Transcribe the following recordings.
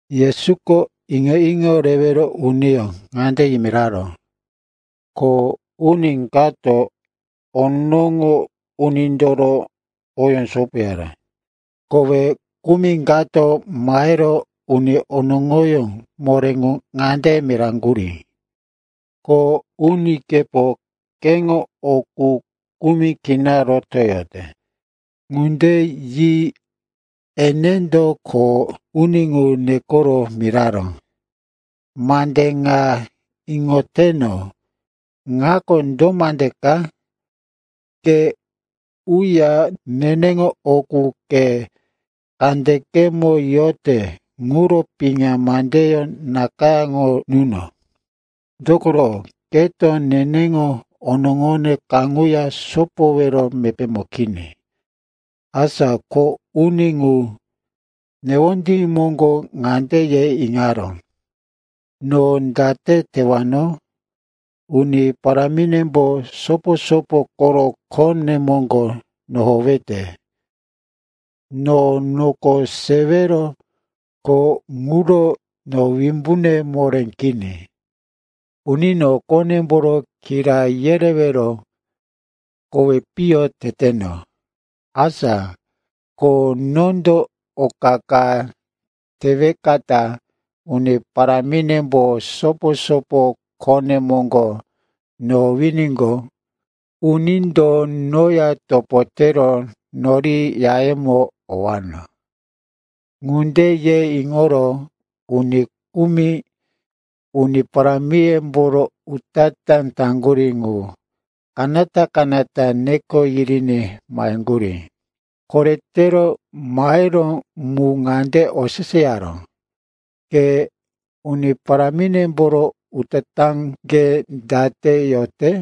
Yesuko iŋo-iŋo rewero uniyó ŋande yimiraró, “Kho uni kato onoŋo unindoro oyó sopoyara. Kowe kumi kato mahero uni onoŋoyó moré ŋu ŋande miraŋgurí, ‘Kho unikepo keŋo o qu kumi kina rotoyote.’ “Ŋunde yi enendo kho uni ŋu nekoro miraró, ‘Mande ŋa iŋoteno ŋako do mande ka? Ke uya neneŋo o qu ke kandekemo yote ŋuro piŋa mandeyó nakayáŋo nuno. Dokoro keto neneŋo onoŋone kaŋuya sopoyowero mepémo kini.’ “Asa kho uni ŋu newondí moŋgo ŋande ye iŋaró, ‘No date tewano? Uni paráminembo sopo-sopo koro khone moŋgo nohowete. No noko sewero kho ŋuro no wimbune moré kini. Unino qonemboro kira yerewero kowi piyo teteno. Asa ko nondo oka ka tewekata uni paráminembo sopo-sopo khone moŋgo nohowiníqo, unindo noya topo tero nori yayemo owano.’ “Ŋunde ye iŋoro uni kumi uni parámiyemboro utatá taŋgurí ŋu kanata-kanata neko yiriní maheŋgurí. Koretero maheró mu ŋande oseseyaró, ‘Ke uni paráminemboro utatáŋge date yote?’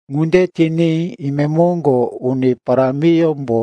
“Ŋunde tiní imemoŋgo uni parámiyómbo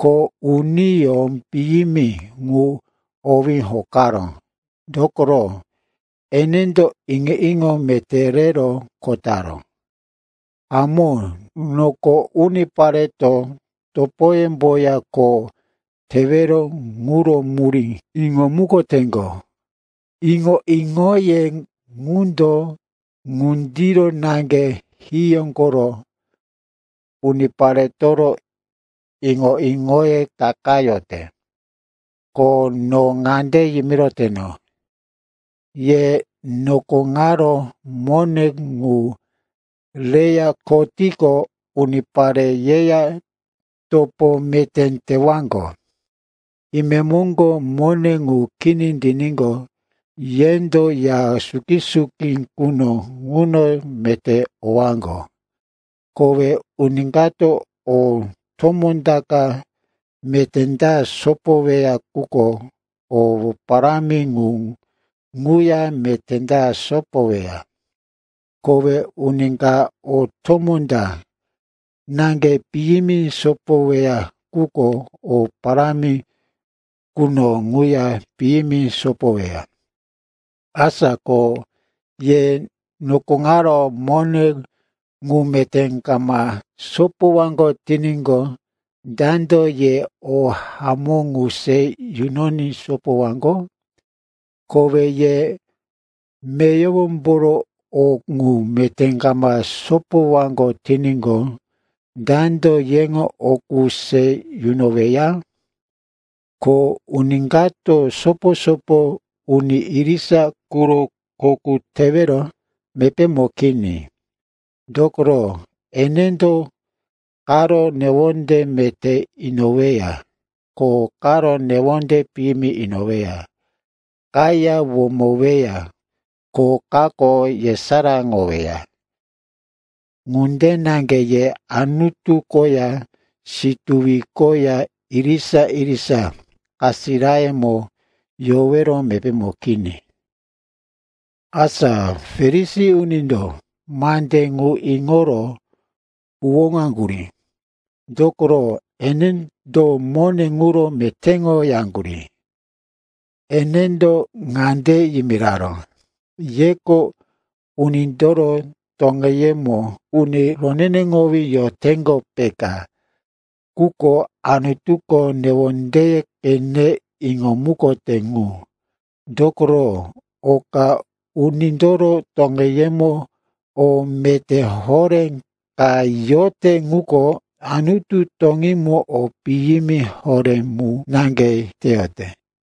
kho uniyó piyimi ŋu owí hokaró. Dokoro enendo iŋo-iŋo meté rero kho taró. Hamó, noko unipareto topoyemboya kho tewero quro murí iŋomukoteŋgo. Iŋo-iŋoye ŋundo ŋundiro naŋge hiyó koro uniparetoro iŋo-iŋoye takayote. Ko no ŋande yimiroteno, ye noko ŋaro mone ŋu reya kho tiqo, unipare yeya topo meté tewaŋgo. Imemoŋgo mone ŋu kini tiníqo, yendo ya suki-suki quno ŋuno meté owaŋgo. “Kowe uni kato o tomó ta ka meté ta sopoweya quko o parámi ŋu ŋuya meté ta sopoweya. Kowe uni ka o tomó ta naŋge piyimi sopoweya quko o parámi quno ŋuya piyimi sopoweya. Asa ko ye noko ŋaro mone ŋu meté kama sopowaŋgo tiníqo, dando ye o hamó ŋu se yunoní sopowaŋgo? Kowe ye meyowomboro o qu meté kama sopowaŋgo tiníqo, dando yeŋo o qu se yunoweya? “Kho uni kato sopo-sopo uni irisa quro kho qu tewero mepémo kini. Dokoro enendo karo newonde meté inoweya, ko karo newonde piyimi inoweya. Kaya womoweya, ko kako yesaráŋoweya. Ŋunde naŋge ye Anutu koya situwi koya irisa-irisa kasirayarimo yowero mepémo kini.” Asa Farisi unindo mandí ŋu iŋoro huwóŋaŋgurí, dokoro enendo mone ŋuro metéŋoyaŋgurí. Enendo ŋande yimiraró, “Yeko unindoro toŋeyemo uni roneneŋowí yoteŋgo, peka. Quko Anutuko newondeye qene iŋomukote ŋu. Dokoro oka unindoro toŋeyemo o meté horé ka yote ŋuko Anutu toŋímo o piyimi horé mu naŋge teyote.”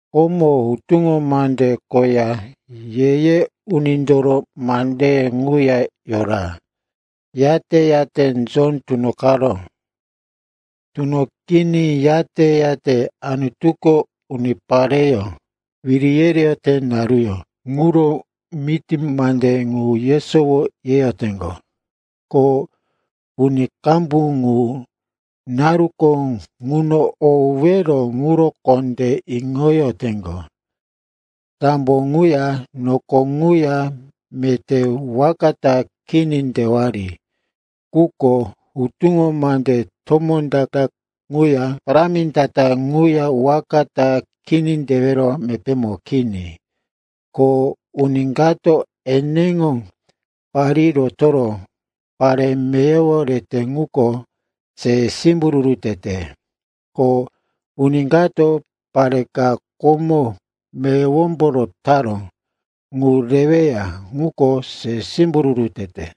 “Komo Hutuŋo Mande koya Ye-ye Unindoro mandeye ŋuya yora, yate-yate Jon tunoqaró. Tunoqiní, yate-yate Anutuko unipareyó wiri yereyote naruyó ŋuro miti mande ŋu yesowo yeyoteŋgo, ko uni qambu ŋu naruko ŋuno owero ŋuro kondé iŋoyoteŋgo. Sambo ŋuya noko ŋuya meté waka ta kini tewari, quko hutuŋo mande tomó ta-ta ŋuya parámi ta-ta ŋuya waka ta kini tewero mepémo kini. “Ko uni kato eneŋo parí rotoro pare meyowo rete ŋuko se simbururu tete. Ko uni kato pare ka komo meyowombo rotaró ŋu reweya ŋuko se simbururu tete.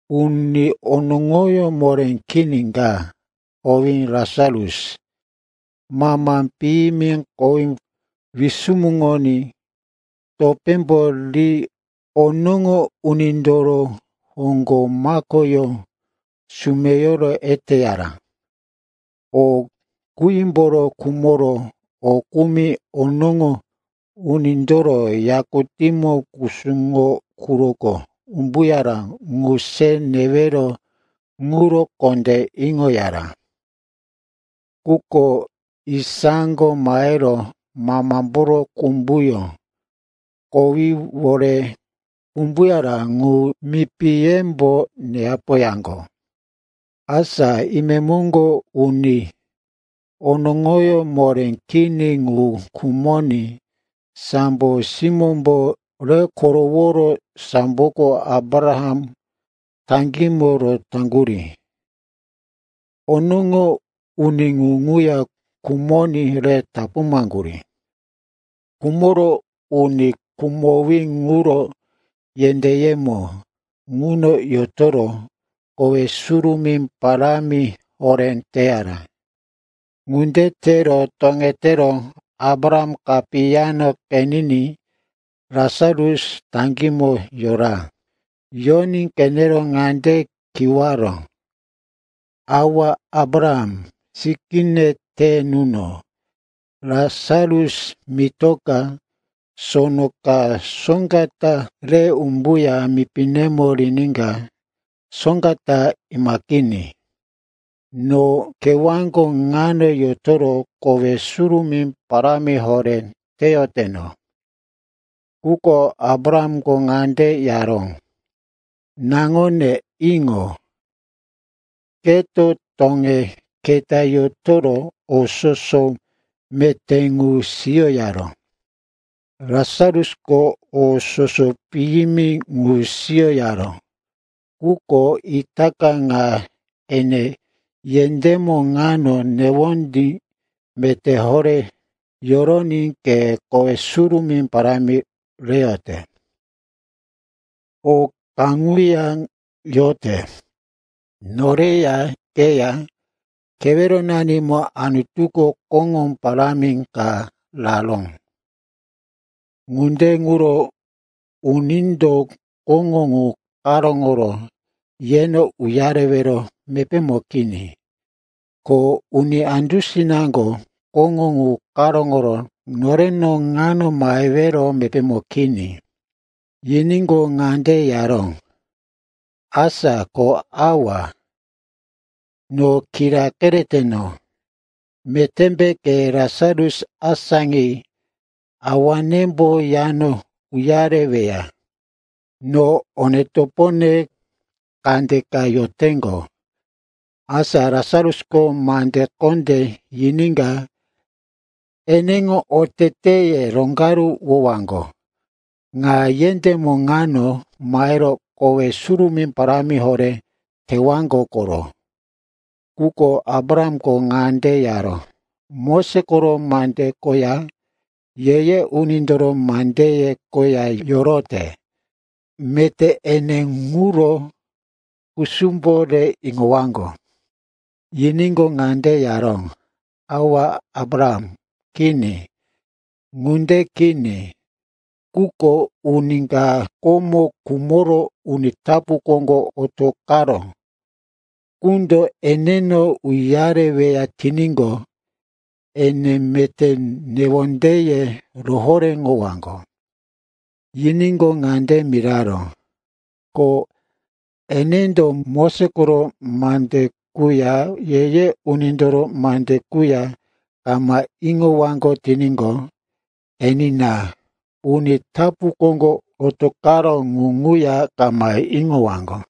Uni onoŋoyó moré kini ka, owí Lasarus, mama piyimi kowí wisumuŋoní, topémbo ri onoŋo unindoro hoŋgo makoyó sumeyoro eteyara. O qímboro khumoro o kumi onoŋo unindoro yakutíŋo kusuŋo quroko umbuyaró ŋu se newero ŋuro kondé iŋoyara. Quko isako mahero mamamboro kumbuyó kowíwore umbuyara ŋu mipiyembo neyapoyaŋgo. “Asa imemoŋgo uni onoŋoyó moré kini ŋu khumoní sambo simómbo re koroworo samboko Abraham taŋgímo rotaŋgurí. Onoŋo uni ŋu ŋuya khumoní re tapuŋaŋgurí. Khumoro uni khumowí ŋuro yendéyemo ŋuno yotoro kowe surumí parámi horé teyara. Ŋunde tero toŋetero Abraham kapiyamo qeniní Lasarus taŋgímo yora. Yoní qenero ŋande kiwaró, ‘Awa Abraham, sikíne te nuno. Lasarus mitoka sono ka soŋga ta re umbuya mipinemo riníka soŋga ta imaqiní. No kewáko ŋano yotoro kowe surumí parámi horé teyoteno.’ “Quko Abrahamko ŋande yaró, ‘Naŋone, iŋo. Keto toŋe keta yotoro o soso meté ŋu siyoyaró. Lasarusko o soso piyimi ŋu siyoyaró. Quko itaka ŋa ene yendémo ŋano newondí meté horé yoroní ke kowe surumí parámi reyote. O kaŋuya yote. Noreya, keya keweronanimo Anutuko koŋó parámi ka raró. Ŋunde ŋuro unindo koŋó ŋu karóŋoro yeno uyarewero mepémo kini. Ko uni andusinaŋgo koŋó ŋu karóŋoro noreno ŋano mahewero mepémo kini.’ “Yiníqo, ŋande yaró, ‘Asa ko, awa, no kira kereteno, metémbe ke Lasarus asáŋi awanembo yano uyareweya. No one-topone kandeka yoteŋgo. Asa Lasarusko mande kondé yiníka eneŋo oteteye roŋgaruwowaŋgo. Ŋa yendémo ŋano mahero kowe surumí parámi horé tewaŋgo koro.’ “Quko Abrahamko ŋande yaró, ‘Moses koro mande koya Ye-ye Unindoro mandeye koya yorote. Meté ene ŋuro kusumbo re iŋowaŋgo.’ “Yiníqo, ŋande yaró, ‘Awa Abraham, kini. Ŋunde kini. Quko uni ka komo khumoro uni tapu koŋgo otoqaró qundo eneno uyareweya tiníqo, ene meté newondeye rohoréŋowaŋgo.’ “Yiníqo, ŋande miraró, ‘Ko enendo Moses koro mande quya Ye-ye Unindoro mande quya kama iŋowaŋgo tiníqo, enina, uni tapu koŋgo otoqaró ŋu ŋuya kama iŋowaŋgo.’”